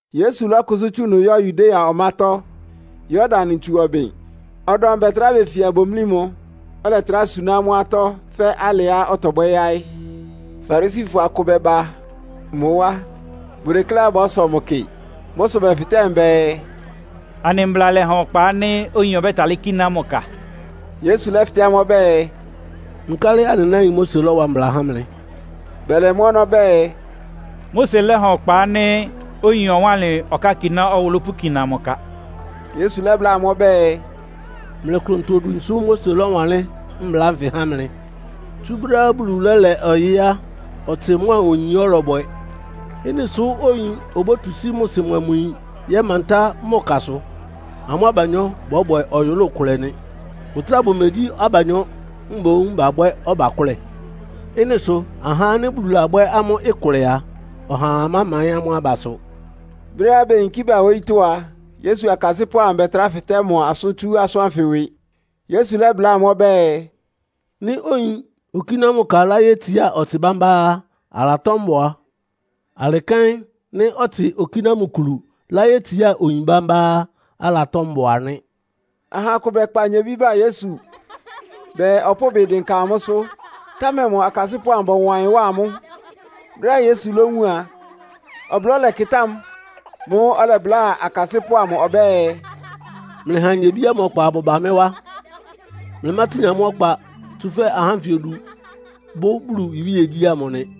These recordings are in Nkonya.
Yesu lɔ́kʋsʋ́ tsú ɩnʋ yɔ́ Yudea ɔmátɔ́, Yordan ntsu ɔbɩn. Ɔdɔm bɛtrá befia bomlí mʋ, ɔlɛtrá suná amʋ́ atɔ́ fɛ́ alɩá ɔtɔbwɛ́ yáɩ́. Farisifɔ akʋ bɛba mʋ wá, bʋdekléá bɔ́sɔ mʋ kɩ. Mʋ́ sʋ bɛfɩtɛ́ mʋ bɛɛ, “Anɩ Mbla lɛha ɔkpa ánɩ́ oyin ɔbɛ́talɩ́ kíná mʋ ka?” Yesu lɛ́fɩtɛ́ amʋ́ ɔbɛ́ɛ, “Nkálɩ anɩ náin Mose lɔ́wa mbla há mlɩ?” Bɛlɛ mʋ ɔnɔ́ bɛɛ, “Mose lɛ́ha ɔkpa ánɩ́ oyin ɔwánlɩn ɔkákiná ɔwʋlʋ́ pʋkina mʋ ka.” Yesu lɛ́bláa amʋ́ ɔbɛ́ɛ, “Mlɩ klʋntɔ-odwin sʋ́ Mose lɔ́wanlɩ́n mbla ánfɩ há mlɩ. Tsú brɛ́á Bulu lɛ́lɛ ɔyɩ́ á, ɔtsɩ mʋ́a oyin ɔ́lɔbwɛ. Ɩ́nɩ sʋ oyin obótu sí mʋ sɩ mʋa mʋ yin yɛ́mantá mʋ kasʋ, amʋ́ abanyɔ́ bɔ́bwɛ ɔyʋlʋ́ʋ kʋlɛ nɩ. Bʋtráa bʋmegyí abanyɔ́, mboún babwɛ́ ɔbakʋ́lɛ. Ɩ́nɩ sʋ ahá ánɩ́ Bulu labwɛ́ amʋ́ ɩkʋlɛ a, ɔhaa mámaɩ́n amʋ́ abasʋ.” Brɛ́á beyinkí ba wóyítɔ́ a, Yesu akasɩ́pʋ́ amʋ bɛtrá fɩtɛ́ mʋ asʋ́n tsú asʋ́n ánfɩ ɩwɩ. Yesu lɛ́bláa amʋ́ ɔbɛ́ɛ, “Nɩ́ oyin okíná mʋ ka láyétsiá ɔtsɩ bámbá á, alatɔ́ mbʋa. Alɩ kɛ́n nɩ́ ɔtsɩ okíná mʋ kulu láyétsiá oyin bámbá á, alatɔ́ mbʋa nɩ́.” Aha akʋ bɛkpa nyebí ba Yesu bɛɛ, ɔpʋ́ʋ ɩbɩ dɩnka amʋ́sʋ́, támɛ mʋ akasɩ́pʋ́ amʋ bɔwa ɩyɩn wá amʋ́. Brɛ́á Yesu lówun a, ɔblɔ́ lɛkɩtá mʋ. Mʋ́ʋ́ ɔlɛbláa akasɩ́pʋ́ amʋ ɔbɛ́ɛ, “Mlɩha nyebí ámʋ ɔkpa abʋba mɩ́ wá. Mlɩmátin amʋ́ ɔkpa, tsúfɛ́ ahá ánfɩ odu bʋ́ Bulu iwíegyí ámʋ nɩ.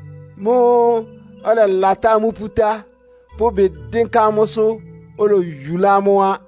Mʋ́ʋ́ ɔlɛlatá amʋ́ pútá, pʋ́ ɩbɩ dɩ́ndɩ́nka amʋ́sʋ́, oloyulá amʋ́ á.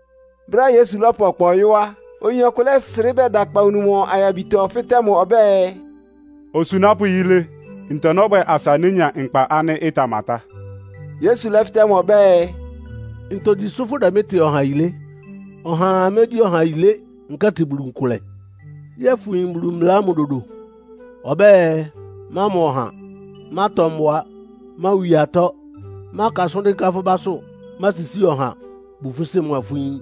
Brɛ́á Yesu lɔ́pʋ ɔkpa ɔyɔ́ á, oyin ɔkʋ lɛ́srɩ́ ba bɛda akpawunu mʋ ayabitɔ fɩ́tɛ́ mʋ ɔbɛ́ɛ, “Osunápʋ́ yilé, ntɔ nɔ́bwɛ asa nénya nkpa ánɩ́ ɩtamatá?” Yesu lɛ́fɩtɛ́ mʋ ɔbɛ́ɛ, “Ntogyi sʋ́ fʋdɛ mɩ́ tɩ ɔha yilé? Ɔhaa mégyí ɔha yilé, nkɛ́tɩ Bulu nkʋlɛ. Yɛ́ɛ fʋyin Bulu mbla ámʋ dodo? Ɔbɛ́ɛ, mámɔ ɔha, mátɔ mbʋa, máwi atɔ́, máka asʋ́n dɩ́nká fʋ́ básʋ́, másisíi ɔha, bu fʋ́ sɩ́ mʋa fʋ́ yín.”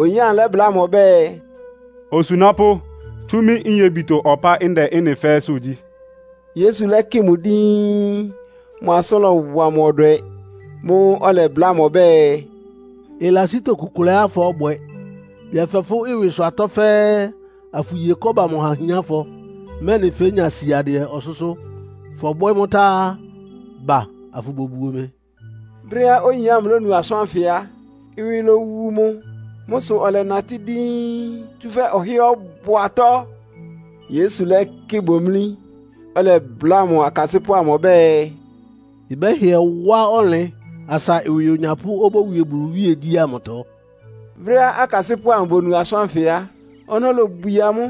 Oyin ámʋ lɛ́bláa mʋ ɔbɛ́ɛ, “Osunápʋ́, tsú mɩ́ nyebitɔ ɔpá ndɛ ɩ́nɩ fɛ́ɛ́sʋ́ gyí.” Yesu lɛ́kɩ mʋ díín, mʋ asʋ́n lɔwa mʋ ɔdwɛ. Mʋ́ʋ́ ɔlɛbláa mʋ ɔbɛ́ɛ, “Ɩlasí tokukʋlɛá fɔ́bwɛ. Yɛfɛ fʋ́ ɩwɩsʋ atɔ́ fɛ́ɛ́, afʋye kɔ́ba amʋ ha ahiánfɔ, mɛ́nɩ fénya siadɩɛ ɔsʋ́sʋ́. Fɔbwɛ́ mʋ́ tá á, ba afʋbobuo mɩ.” Brɛ́á oyin ámʋ lónu asʋ́n ánfɩ á, ɩwɩ lowu mʋ. Mʋ́ sʋ ɔlɛnatɩ́ díín, tsúfɛ́ ɔhɩ́ɛ́ ɔbʋ atɔ́. Yesu lɛ́kɩ bomlí, ɔlɛbláa mʋ akasɩ́pʋ́ amʋ ɔbɛ́ɛ, “Ɩbɛ́hɩɛ wá ɔnlɩn asa ɩwɩ onyapʋ́ obówie Bulu iwíegyí ámʋtɔ!” Brɛ́á akasɩ́pʋ́ amʋ bonu asʋ́n ánfɩ á, ɔnɔ́ lobwie amʋ́.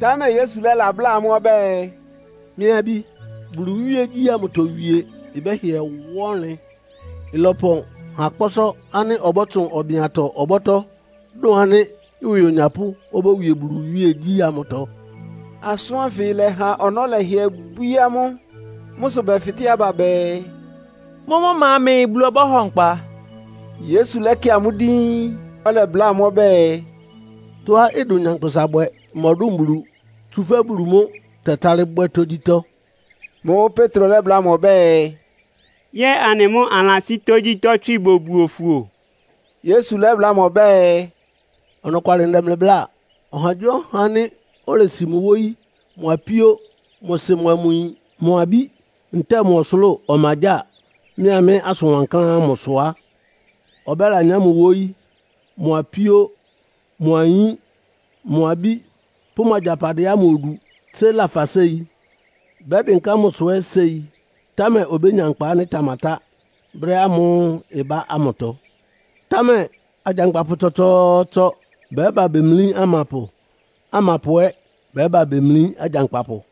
Támɛ Yesu lɛ́labláa amʋ́ ɔbɛ́ɛ, “Mɩ́ abí, Bulu iwíegyí ámʋtɔ wie ɩbɛ́hɩɛ wá ɔnlɩn! Ɩlɔpɔn ha kpɔ́sɔ́ ánɩ́ ɔbɔ́tsʋn ɔbɩn-atɔ ɔbɔ́tɔ́, dʋ́n ánɩ́ ɩwɩ onyapʋ́ obówie Bulu iwíegyí ámʋtɔ.” Asʋ́n ánfɩ lɛha ɔnɔ́ lɛhɩɛ bwíé amʋ́. Mʋ́ sʋ bɛfɩtɛ́ aba bɛɛ, “Mʋ́mʋ́ ma mɛɛ Bulu ɔbɔ́hɔ nkpa?” Yesu lɛ́kɩ amʋ́ díín, ɔlɛbláa amʋ́ ɔbɛ́ɛ, “Tɔ́á ɩdʋn nyankpʋsa bwɛ mɔdʋ́n Bulu, tsúfɛ́ Bulu mʋ́ tɛtálɩ́ bwɛ́ tógyítɔ́.” Mʋ́ʋ́ Petro lɛ́bláa mʋ ɔbɛ́ɛ, “Yɛ́ɛ anɩ mʋ́ anɩlasí tógyítɔ́ tswɩ bobuo fʋ o!” Yesu lɛ́bláa mʋ ɔbɛ́ɛ, “Ɔnɔkwalɩ ndɛ mlɩ bláa. Ɔhagyíɔha ánɩ́ olesi mʋ wóyí, mʋ apíó, mʋ sɩ mʋa mʋ yin, mʋ abí ntɛ́ɛ mʋ ɔsʋlʋ́ʋ ɔmagyáa, mɩ́a mɩ́ asʋn wankláán ámʋ sʋ á, ɔbɛ́lanyá mʋ wóyí, mʋ apíó, mʋ ayín, mʋ abí pʋ́ mʋ agyapadɩɛ ámʋ odu tsé lafa séi. Bɛ́dɩnká mʋsʋ ɛ́ séi, támɛ obénya nkpa ánɩ́ ɩtamatá brɛ́ ámʋ́ʋ́ ɩbá ámʋtɔ. Támɛ agyankpapʋ tsɔtsɔɔtsɔ bɛ́ba bemlí amapʋ, amapʋ ɛ́ bɛ́ba bemlí agyankpapʋ.”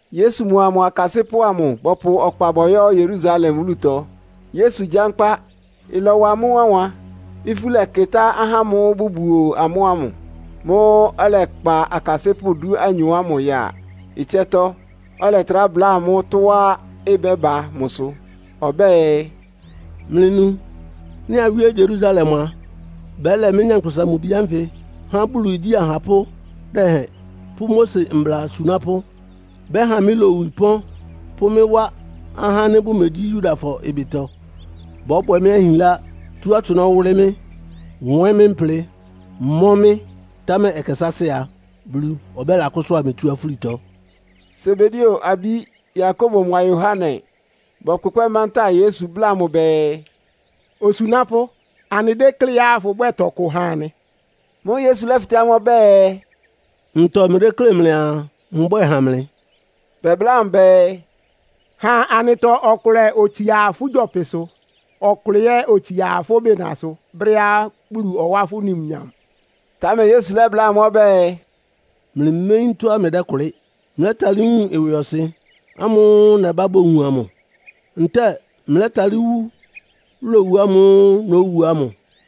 Yesu mʋa mʋ akasɩ́pʋ́ amʋ bɔpʋ ɔkpa bɔyɔ́ Yerusalem wúlutɔ, Yesu gyánkpá. Ɩlɔwa amʋ́ wánwan, ifú lɛkɩtá ahá ámʋ́ʋ́ bʋbuo amʋ́ ámʋ. Mʋ́ʋ́ ɔlɛkpa akasɩ́pʋ́ dúanyɔ ámʋ ya ɩtsɛ́tɔ́, ɔlɛtrá bláa amʋ́ tɔ́á ɩbɛ́ba mʋsʋ. Ɔbɛ́ɛ, “Mlɩnu! Nɩ́ awíé Yerusalem a, bɛ́lɛ mɩ́, Nyankpʋsa-Mʋ-Bi ánfɩ há Bulu igyí ahapʋ́ dɛhɛn pʋ́ Mose mbla asunápʋ́. Bɛ́ha mɩ́ lowu ɩpɔ́n, pʋ́ mɩ́ wá ahá ánɩ́ bʋmegyí Yudafɔ ɩbɩtɔ. Bɔ́bwɛ mɩ́ ahinlá, tú atsʋnɔ́ wʋ́lɩ́ mɩ́, nwɛ́n mɩ́ mplɩ, mɔ́ mɩ́, támɛ ɛkɛ sáásɩ́ a, Bulu ɔbɔ́kʋsʋ́a mɩ tsú afúlitɔ.” Sebedeo abí Yakobo mʋa Yohane bɔkpʋkpɛ́ mantáa Yesu bláa mʋ bɛɛ, “Osunápʋ́, anɩdékléá fʋbwɛ́ɛ tɔkʋ ha anɩ.” Mʋ́ʋ́ Yesu lɛ́fɩtɛ́ amʋ́ ɔbɛ́ɛ, “Ntɔ mlɩdéklé mlɩaa mbwɛ́ɛ ha mlɩ?” Bɛbláa mʋ bɛɛ, “Ha anɩtɔ ɔkʋlɛ otsia fʋ́ gyɔpɩsʋ, ɔkʋlɛ ɛ́ otsia fʋ́ bɩnasʋ brɛ́á Bulu ɔwá fʋ́ numnyam.” Támɛ Yesu lɛ́bláa amʋ́ ɔbɛ́ɛ, “Mlɩméyín tɔ́á mlɩdɛ́kʋlɩ́! Mlɛ́talɩ́ wun ɩwɩɔsɩn ámʋ́ʋ́ nɛbá bowun amʋ, ntɛ́ɛ mlɛ́talɩ́ wú lowu ámʋ́ʋ́ nówu ámʋ?”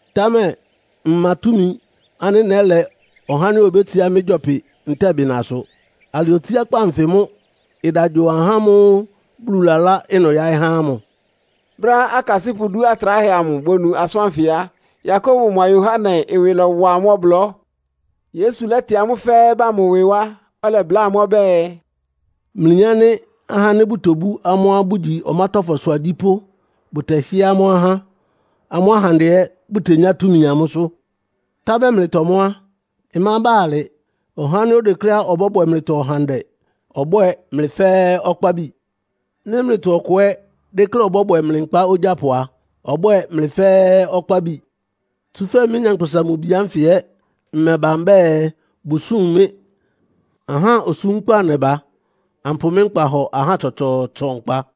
támɛ mma túmi ánɩ́ nɛ́lɛ ɔhá ánɩ́ obétsiá mɩ́ gyɔpɩ ntɛ́ɛ bɩnasʋ. Alɩ otsiákpá anfɩ mʋ́ ɩda gyo ahá ámʋ́ʋ́ Bulu lalá ɩnʋ yáɩ́ há ámʋ.” Brɛ́á akasɩ́pʋ́ idú atráhɛ amʋ bonu asʋ́n ánfɩ á, Yakobo mʋa Yohane ɩwɩ lɔ́wa amʋ́ ɔblɔ́. Yesu lɛ́tɩ amʋ́ fɛ́ɛ́ ba mʋ ɩwɩ wá, ɔlɛbláa amʋ́ ɔbɛ́ɛ, “Mlɩyin ánɩ́ ahá ánɩ́ bʋtobú amʋ́á bʋgyi ɔmátɔ́fɔsʋ agyípʋ́ bʋtɛhɩ́ɛ́ amʋ́ ahá, amʋ́ ahandɛ ɛ́ bʋtenyá túmi amʋ́sʋ́. Támɛ mlɩtɔ mʋ́ á, ɩmába alɩ. Ɔhá ánɩ́ odekléá ɔbɔ́bwɛ mlɩtɔ ɔhandɛ ɔbwɛ́ɛ mlɩ fɛ́ɛ́ ɔkpábi. Nɩ́ mlɩtɔ ɔkʋ ɛ́ dékléá ɔbɔ́bwɛ mlɩ nkpá ogyápʋ a, ɔbwɛ́ɛ mlɩ fɛ́ɛ́ ɔkpábi. Tsúfɛ́ mɩ́, Nyankpʋsa-Mʋ-Bi ánfɩ ɛ́ mmɛba mbɛ́ɛ, bʋsúm mɩ́. Ahá osúmkpá nɛba, ampʋ mɩ́ nkpa hɔ ahá tsɔtsɔɔtsɔ nkpa.”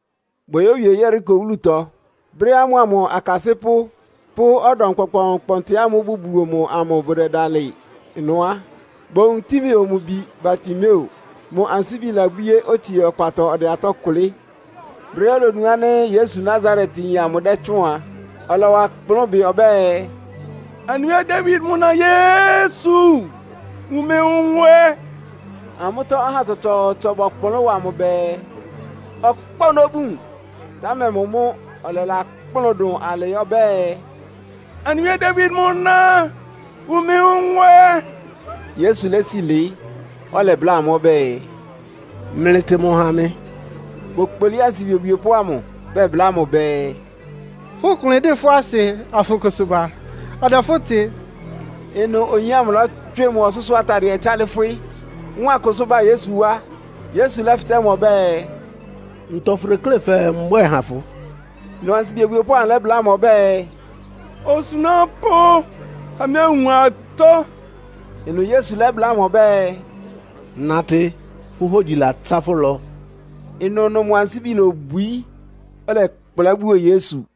Boyówie Yeriko wúlutɔ. Brɛ́á mʋa mʋ akasɩ́pʋ́ pʋ́ ɔdɔm kpɔnkpɔɔnkpɔntɩ ámʋ́ʋ́ bʋbuo mʋ amʋ bʋdɛdalɩ ɩnʋ á, bowun Timeo mʋ bi Bartimeo. Mʋ ansíbi labwíé, otsie ɔkpatɔ ɔdɛ atɔ́ kʋlɩ́. Brɛ́á olonu ánɩ́ Yesu Nasaretyin amʋ dɛ́tsʋ́ʋn a, ɔlɔwa kplʋ́n bɩ ɔbɛ́ɛ, “Anɩ Wíe Dawid mʋ na Yesu, wun mɩ nwɛ!” Amʋ́tɔ́ ahá tsɔtsɔɔtsɔ bɔkplʋ́n wa mʋ bɛɛ, ɔkpá ɔnɔ́ bun, támɛ mʋ mʋ́ ɔlɛlakplʋ́n dʋn alɩ ɔbɛ́ɛ, “Anɩ Wíe Dawid mʋ na, wun mɩ nwɛ!” Yesu lési lɩɩ́, ɔlɛbláa amʋ́ ɔbɛ́ɛ, “Mlɩtɩ mʋ ha mɩ.” Bokpolí ansibi obwiepʋ́ ámʋ, bɛbláa mʋ bɛɛ, “Fʋ́ klʋn ɩdɩ́ fʋ́ asɩ, afʋkʋsʋ ba. Ɔdɛ fʋ́ tɩ!” Ɩnʋ oyin ámʋ lɔ́tswɩ mʋ ɔsʋ́sʋ́ atadɩɛ tsálɩ́fwɩ́, wáan kʋsʋ́ ba Yesu wá. Yesu lɛ́fɩtɛ́ mʋ ɔbɛ́ɛ, “Ntɔ fʋdeklé fɛɛ mbwɛ́ɛ ha fʋ?” Ɩnʋ ansibi obwiepʋ́ ámʋ lɛ́bláa mʋ ɔbɛ́ɛ, “Osunápʋ́, ha mɩ́ anwun atɔ́!” Ɩnʋ Yesu lɛ́bláa mʋ ɔbɛ́ɛ, “Natɩ, fʋ́ hógyi latsá fʋ́ ɩlɔ.” Ɩnʋnʋ mʋ ansíbi lobwií, ɔlɛkplá buo Yesu.